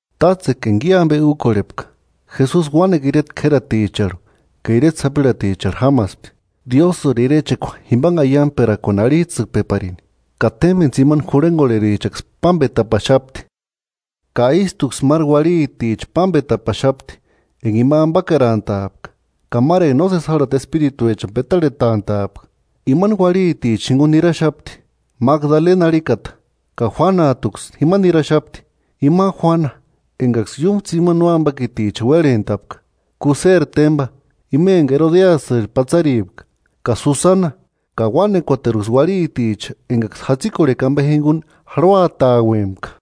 Tátsekua enga i ambe úkorhepka, Jesusi uánekua ireta k'ératicharhu ka ireta sapirhaticharhu jámaspti, Diósïri irechekua jimbanhe aiangperakuani arhijtsïkpeparini. Ka témbeni tsimani jurhengorherichaksï pámbetapaxapti, ka ístuksï máru uarhiticha pámbetapaxapti enga ima ambakerantaapka ka máru enga nósesi járhati espirituechani petarhetantaapka. Imani uarhitichani jinguni niraxapti, Magdalena arhikata ka Juanajtuksï jima niraxapti, ima Juana engaksï iúmu tsimani nóambakiticha uérhentapka; Kúseri témba, ima enga Erodesiri patsaripka ka Susana, ka uánekuateruksï uarhiticha engaksï jatsikorhekua ambe jinguni jarhuatauempka.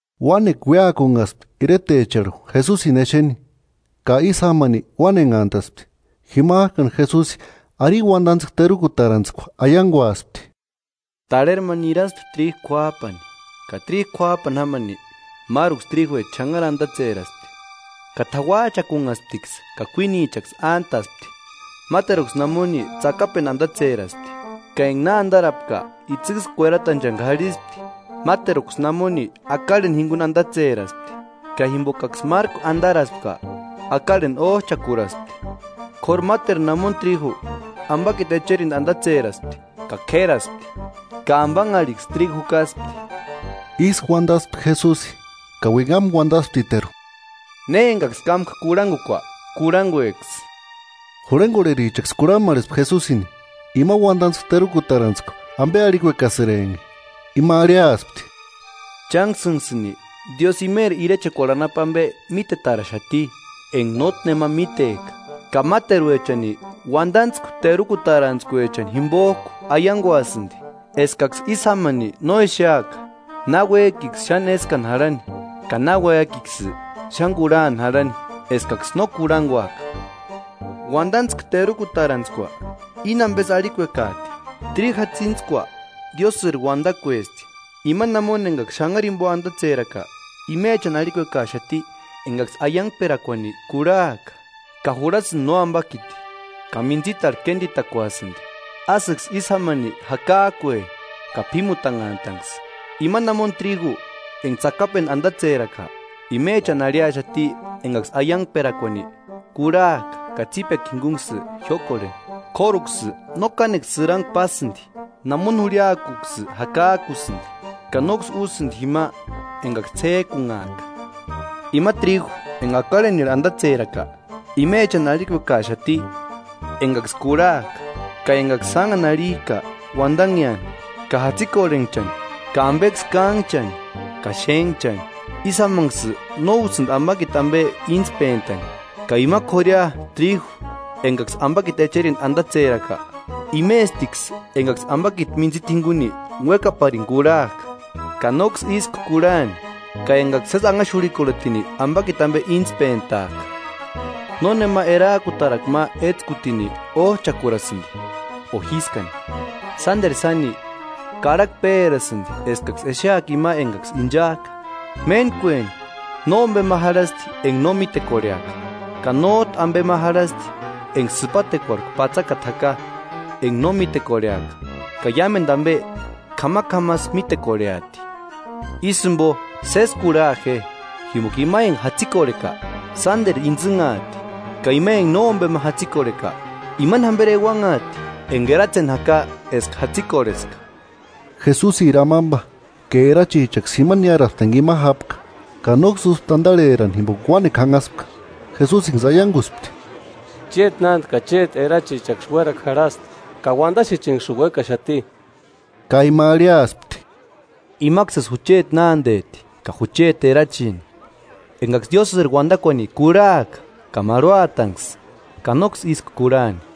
Uánekua uéakunhaspti iretecharhu Jesusini exeni, ka ísï jámani uánenhantaspti. Jimajkani Jesusi arini uandantskua terukutarantskua aianguaspti: “Tarheri ma niraspti tríju k'uájpani. Ka tríju k'uájpani jámani, máruksï tríjuecha xanhari andatseraspti ka t'auajchakunhasptiksï ka kuínichaksï ántaspti. Máteruksï namoni tsakapendu andatseraspti; ka enga na andarapka, itsïksï kueratanchani k'arhispti. Máteruksï namoni akarheni jinguni andatseraspti; ka jimbokaksï márku andaraspka, akarheni ójchakuraspti. K'óru máteru namoni tríju ambakiti echerindu andatseraspti; ka k'éraspti, ka ambanharhiksï tríju jukaspti.” Ísï uandaspti Jesusi ka uinhamu uandasptiteru: “¡Ne engaksï kámka kurhangukua, kurhangueksï!” Jurhengorherichaksï kurhamarhespti Jesusini, ima uandantskua terukutarantskua ambe arhikuekasïrempki. Ima arhiaspti: “Chánksïnksïni Diósï imeri irechekuarhu anapu ambe mítetaraxati enga nótki nema mítejka, ka máteruechani uandantskua terukutarantskuechani jimbojku aianguasïndi, eskaksï ísï jámani no exeaka, náuejkiksï xáni éskani jarhani, ka náuejkiksï xáni kurhani jarhani eskaksï no kurhanguaka.” “Uandantskua terukutarantskua íni ambesï arhikuekajti: Tríju jatsintskua Diósïri uandakuesti; ima namoni enga xanhari jimbo andatseraka imechani arhikuekaxati engaksï aiangperakuani kurhajka ka jurhasïndi nóambakiti ka mintsitarhu kénditakuasïndi, ásïksï ísï jámani jakajkue ka p'ímutanhantanksï. Ima namoni tríju enga tsakapendu andatseraka; imechani arhiaxati engaksï aiangperakuani kurhajka ka tsípekua jingunksï jiókorheni, k'óruksï no kánekua sïrangua pásïndi; namoni jurhiajkuksï jakajkusïndi, ka nóksï úsïndi jima engaksï ts'éjkunhajka. Ima tríju enga akarhenirhu andatseraka imechani arhikuekaaxati engaksï kurhajka, ka engaksï sánhani arhijka uandanheani ka jatsikorhenhchani ka ambeksï kánhchani ka xénhchani, ísï jámanksï no úsïndi ambakiti ambe íntspentani. Ka ima k'ória tríju engaksï ambakiti echerindu andatseraka, imestiksï engaksï ambakiti mintsita jinguni uékaparini kurhajka ka nóksï ísku kurhani, ka engaksï sési anhaxurhikorhetini ambakiti ambe íntspentajka.” “Nónema erajkutarakua ma étskutini ójchakurasïndi o jískani; sánderu sáni, karhakua pérasïndi eskaksï exeaka ima engaksï inchajka. Méntkueni, nómbema jarhasti enga no mítekorheaka, ka nójtu ambe ma jarhasti enga sïpatekuarhku patsakata jaka enga no mítekorheaka, ka iámendu ambe k'amak'amasï mítekorheati.” “Ísï jimbo sési kurha je, jimboka ima enga jatsikorheka, sánderu intsïnhaati; ka ima enga nómbema jatsikorheka, imani jamberi euanhaati enga eratseni jaka eska jatsikorheska.” Jesusiri amamba ka erachichaksï jima niáraspti enga ima jápka, ka nóksï úspti andarherani jimboka uánekua janhaspka. Jesusinksï aianguspti: –Chéti nánde ka chéti erachichaksï uérakua jarhasti, ka uandaxechenksïni uékaxati. Ka ima arhiaspti: –Imaksïsï jucheti nándeti ka jucheti erachini, engaksï Diósïri uandakuani kurhajka ka marhuatanksï; ka nóksï ísku kurhani.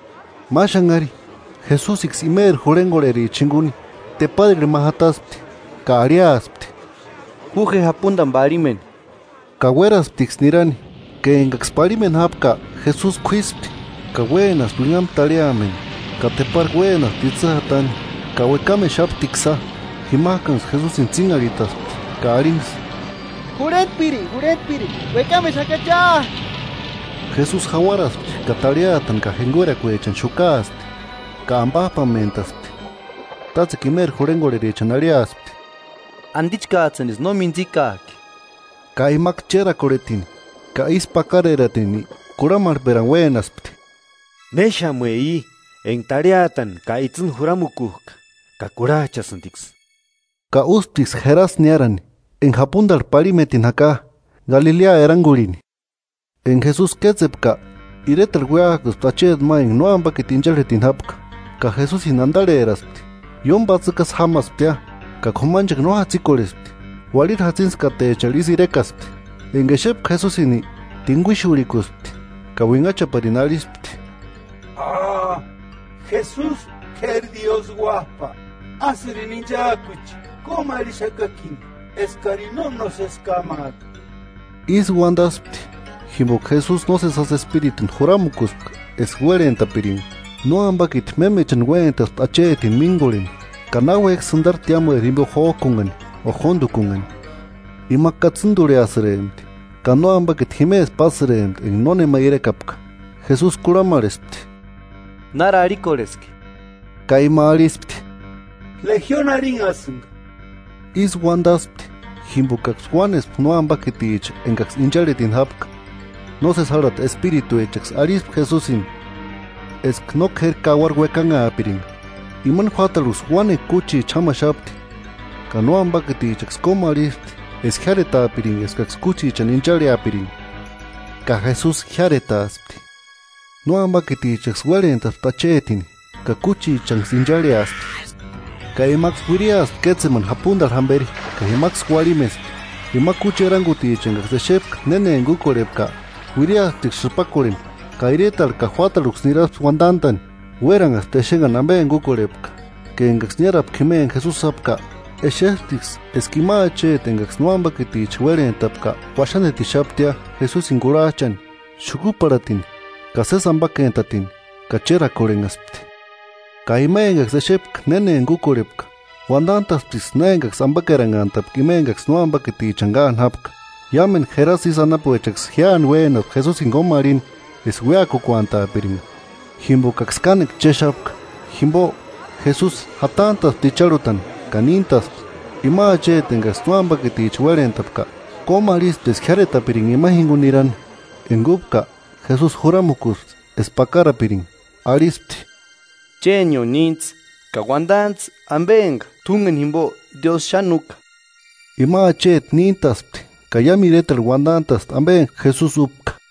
Ma xanhari, Jesusiksï imeri jurhengorherichani jinguni teparirhu ma jataspti, ka arhiaspti: –Ju je japundani parhimeni. Ka uérasptiksï nirani, ka engaksï parhimeni jápka Jesusi k'uíspti. Ka uénaspti uinhamu tarhiameni, ka tepari uénaspti itsï jatani ka uekamexaptiksïa. Jimajkanksï Jesusini tsínharhitaspti ka arhinksï: –¡Jurhentpiri! ¡Jurhentpiri! ¡Uekamexakachia! Jesusi jauarasti ka tarhiatani ka jenguerakuechani xukaaspti, ka ambajpatespti. Tátsekua imeri jurhengorherichani arhiaspti: –¿Andichkajtsïnisï no mintsikajki? Ka imaksï chérakorhetini ka ísku pakareratini kurhamarhperani uénaspti: –¿Néxamue i enga tarhiatani ka itsïni juramukujka ka kurhajchasïndiksï? Ka úsptiksï Jerasa niárani, enga japundarhu parhimetini jaka, Galilea erangurhini. Enga Jesusi kétsepka, iretarhu uéakuspti acheti ma enga nóambakiti incharhetini jápka, ka Jesusini andarheraspti. Ióni patsïkjasï jámasptia, ka k'umanchekua no jatsikorhespti, uarhiri jatsintskatecharhu ísï irekaspti. Enga exepka Jesusini, tinguixurhikuspti ka uinhachaparini arhispti: –¡Jesusi K'éri Diósï Uájpa, ásïrini inchaakuche! ¡Kómarhixakakini eskarini no nósesi kámaaka! Ísï uandaspti jimboka Jesusi nósesi jásï espirituni juramukuspka eska uérhentapiringa. Nóambakiti mémechani uéntaspti achetini míngorheni; ka náuejki sïndari tiámueri jimbo jójkunhani ka jóndukunhani, ima katsïndurhiasïrempti, ka nóambakiti jimesï pásïrempti enga nónema irekapka. Jesusi kurhamarhespti: –¿Nári arhikorheski? Ka ima arhispti: –Lejioni arhinhasïnga. Ísï uandaspti jimbokaksï uánespka nóambakiticha engaksï incharhetini jápka, nósesi járhati espirituechaksï arhispti Jesusini eska no k'éri kauaru uekanhaapiringa. Imani juátarhuksï uánekua kúchicha jámaxapti, ka nóambakitichaksï kómarhispti eska jiáretaapiringa eskaksï kúchichani incharheapiringa; ka Jesusi jiáretaaspti. Nóambakitichaksï uérhentaspti achetini ka kúchichanksï incharheaspti, ka imaksï uiriaspti kétsemani japundarhu jamberi ka jimaksï uarhimespti. Ima kúchi eranguticha engaksï exepka néna enga úkorhepka uiriasptiksï sïpakorheni ka iretarhu ka juátarhuksï niraspti uandantani. Uéranhaspti exenhani ambe enga úkorhepka. Ka engaksï niárapka jima enga Jesusi jápka, exesptiksï eska ima acheti engaksï nóambakiticha uérhentapka uaxandetixaptia Jesusini kurhajchani, xukuparhatini ka sési ambakentatini; ka chérakorhenhaspti. Ka ima engaksï exepka néna enga úkorhepka, uandantasptiksï na engaksï ambakeranhantapka ima enga nóambakitichani káani jápka. Iámendu Jerasa isï anapuechaksï jíani uénaspti Jesusini kómarhini eska uéakukuantaapiringa, jimbokaksï kánekua chéxapka. Jimbo, Jesusi jatantaspti icharhutani ka níntaspti. Ima acheti engaksï nóambakiticha uérhentapka, kómarhispti eska jiáretapiringa imani jinguni nirani, enga úpka, Jesusi juramukuspti eska pakarapiringa, arhispti: 39–Chénio níntsï ka uandantsï ambe enga t'úngeni jimbo Diósï xáni úka. Ima acheti níntaspti ka iámu iretarhu uandantaspti embe enga Jesusi úkupka.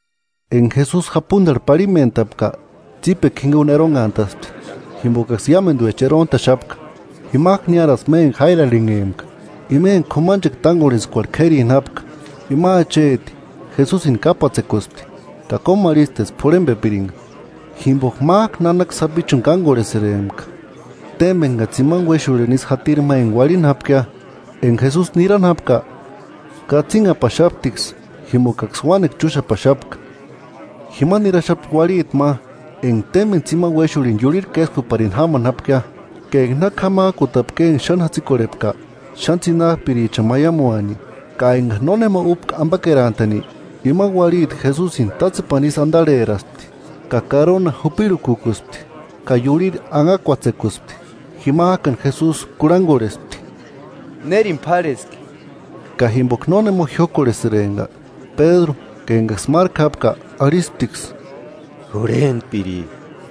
Enga Jesusi japundarhu parhimentapka, tsípekua jinguni eronhantaspti, jimbokaksï iámenduecha erontaxapka. Jimajku niáraspti ma enga Jáiru arhinhempka, ima enga k'umanchekua tángorhentskuarhu k'érini jápka. Ima acheti, Jesusini kápatsekuspti, ka kómarhispti eska p'urhembepiringa, jimboka májku nanaka sapichuni kángorhesïrempka, témbeni ka tsimani uéxurhini isï jatiri ma enga uarhini jápkia. Enga Jesusi nirani jápka, katsinhapaxaptiksï jimbokaksï uánekua chúxapaxapka. Jima niraxapti uarhiti ma enga témbeni tsimani uéxurhini iurhiri késkuparini jámani jápkia, ka enga na k'amajkutapkia eska xáni jatsikorhepka, xáni tsinajpirichani maiamuaani, ka enga nónema úpka ambakerantani. Ima uarhiti Jesusini tátsepani ísï andarheraspti ka karona jupirhukukuspti, ka iurhiri anhakuatsekuspti. Jimajkani Jesusi kurhangorhespti: –¿Nérini p'árheski? Ka jimboka nónema jiókorhesïrempka, Pédru ka engaksï márku jápka arhisptiksï: –Jurhentpiri,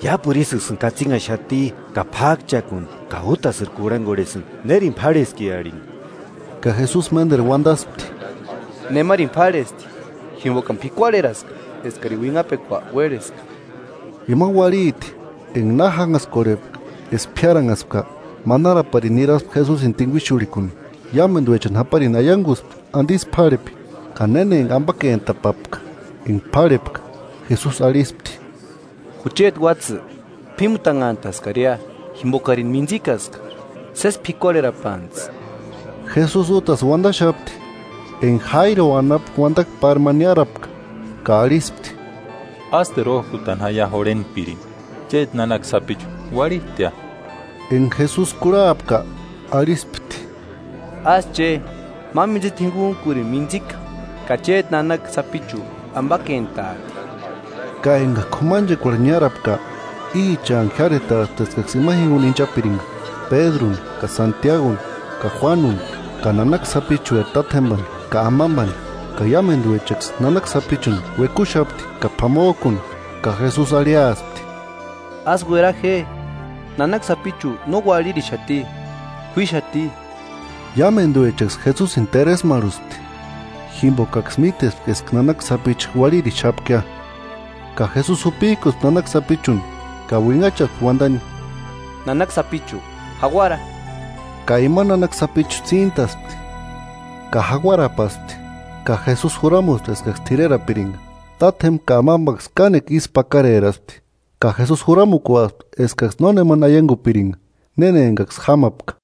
iápuru ísïksïni katsinhaxati ka p'ákchakuni ka útasïri kurhangorhesïnga: ¿Nérini p'árheski arhini? Ka Jesusi ménderu uandaspti: –Nemarini p'árhesti, jimbokani p'ikuarheraska eskarini uinhapekua uérheska. Ima uarhiti, enga na jánhaskakorhepka eska piáranhaspka, manaraparini niraspti Jesusini tinguixurhikuni. Iámenduechani japarini aianguspti andisï p'árhepi, ka néna enga ambakentapapka enga p'árhepka. Jesusi arhispti: –Jucheti uátsï, p'ímutanhantaskaria jimbokarini mintsikaska. Sési p'ikuarherapantsï. Jesusi útasï uandaxapti, enga Jáiro anapu uandakua pári ma niárapka, ka arhispti: –Ásteru ójkutani jaia jurhentpirini; chéti nanaka sapichu uarhistia. Enga Jesusi kurhapka, arhispti: –Ásï che; ma mintsita jinguntkurini mintsika, ka chéti nanaka sapichu ambakentaati. Ka eka k'umanchekuarhu niárapka, íchanku jiáretaspti eskaksï ima jinguni inchapiringa: Pédruni ka Santiaguni ka Juánuni, ka nanaka sapichueri tátjemba ka amambani. Iámenduechaksï nanaka sapichuni uekuxapti ka p'amojkuni, ka Jesusi arhiaspti: “Ásï uera je; nanaka sapichu no uarhirixati, k'uíxati. Iámenduechaksï Jesusini teresmarhuspti, jimbokaksï mítespka eska nanaka sapichu uarhirixapkia. Ka Jesusi jupijkuspti nanaka sapichuni ka uinhachaspti uandani: –¡Nanaka sapichu, Jauara! Ka ima nanaka sapichu tsíntaspti; ka jauarapaspti, ka Jesusi juramuspti eskaksï t'irerapiringa. Tátjemba ka amambaksï kánekua ísku pakareraspti, ka Jesusi juramukuaspti eskaksï nónemani aiangupiringa néna engaksï jámapka.”